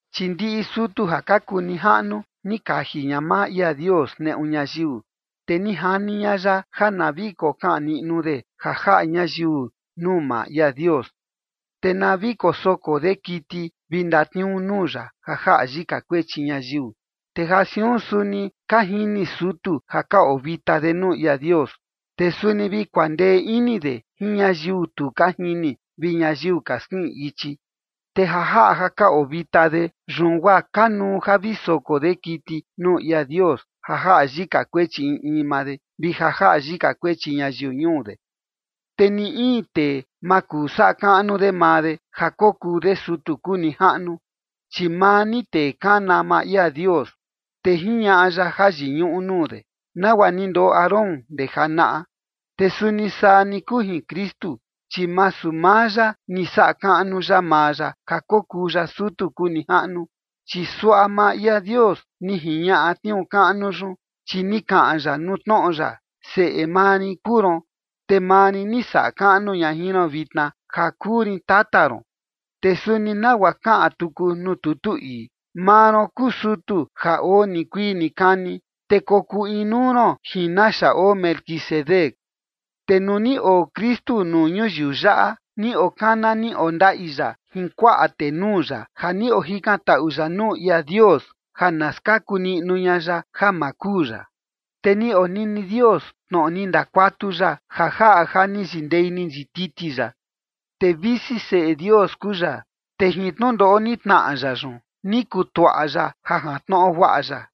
Chi ndiꞌi sutu ja ka kuu nijaꞌnu, ni kaji ña maa ia Dios neꞌu ñayiu, te ni jani ña ya ja na vi kokaꞌan niꞌnu de ja jaꞌa ñayiu nuu maa ia Dios, te na vi kosoko de kiti vi ndatniuu nuu ya ja jaꞌa yika kuechi ñayiu. Te ja siun suni ka jini sutu ja ka oo vita de nuu ia Dios, te suni vi kuandee ini de jin ñayiu tu ka jini vi ñayiu ka skiꞌin ichi. Te ja jaꞌa ja ka oo vita de, yun guaa kanuu ja vi soko de kiti nuu ia Dios ja jaꞌa yika kuechi in in maa de, vi ja jaꞌa yika kuechi ñayiu ñuu de. Te ni in tee ma kuu saꞌa kaꞌnu de maa de ja kokuu de sutu kuu nijaꞌnu, chi maa ni tee kana maa ia Dios, te jiñaꞌa ya jayiñuꞌu nuu de, nagua ni ndoꞌo Aarón ndee janaꞌa. Te suni saa ni kuu jin Kristu, chi masu maa ya ni saꞌa kaꞌnu ya maa ya ja kokuu ya sutu kuu nijaꞌnu, chi suaꞌa maa ia Dios ni jiñaꞌa tniuu kaꞌnu yun, chi ni kaꞌan ya nuu tnoꞌo ya: Seꞌe maa rin kuu ron, te maa rin ni saꞌa kaꞌnu ña jin ron vitna, ja kuu rin tata ron. Te suni nagua kaꞌan tuku nuu tutu ii: Maa ron kuu sutu ja oo nikuii nikani, te kokuu inuu ron jin naxa oo Melquisedec. Te nuu ni oo Kristu nuu ñuyiu yaꞌa, ni okana ni ondaꞌi ya jin kuaꞌa tenuu ya ja ni ojikantaꞌu ya nuu ia Dios ja na skaku niꞌnu ña ya ja ma kuu ya. Te ni onini Dios tnoꞌo ni ndakuatu ya ja jaꞌa ja ni yindei ni yititi ya. Te visi Seꞌe Dios kuu ya, te jin tnundoꞌo ni tnaꞌa ya yun, ni kutuaꞌa ya ja jantnoꞌo guaꞌa ya.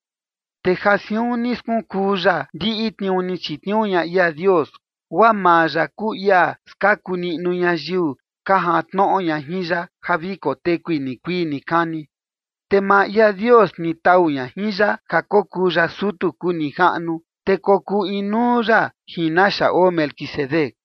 Te ja siun ni skunkuu ya ndiꞌi tniuu ni chitniuu ña ia Dios, guaa maa ya kuu ia skaku niꞌnu ñayiu ka jantnoꞌo ña jin ya ja vi kotekui nikuii nikani. Te maa ia Dios ni tau ña jin ya ja kokuu ya sutu kuu nijaꞌnu, te kokuu inuu ya jin naxa oo Melquisedec.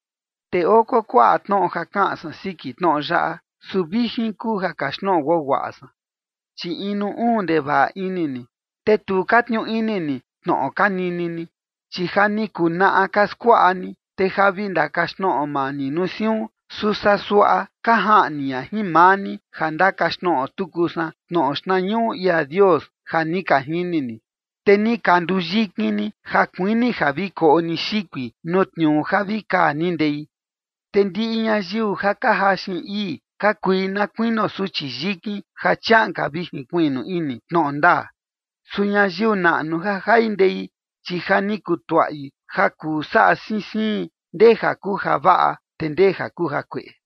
Te oo kuakuaꞌa tnoꞌo ja kaꞌan san siki tnoꞌo yaꞌa, su vijin kuu ja kaxtnoꞌo guaguaꞌa san, chi inu uun ndevaꞌa ini ni, te tu ka tniuu ini ni tnoꞌo ka nini ni. Chi ja ni kunaꞌa ka skuaꞌa ni, te ja vi ndakaxtnoꞌo maa ni nuu siun. Su saa suaꞌa ka jaꞌni ña jin maa ni ja ndakaxtnoꞌo tuku san tnoꞌo xtnañuꞌu ia Dios ja ni ka jini ni, te ni ka nduyikin ni ja kuini ja vi koꞌo ni xikui nuu tniuu ja vi kaa ni ndei. Te ndiꞌi ñayiu ja ka jaxin ii ka kui na kuinio suchi yikin ja chiaꞌan ka vi jinkuiꞌnu ini tnoꞌo ndaa. Su ñayiu naꞌnu ja jai ndei, chi ja ni kutuaꞌi ja kuu saꞌa siin siin ndee ja kuu javaꞌa te ndee ja kuu jakueꞌe.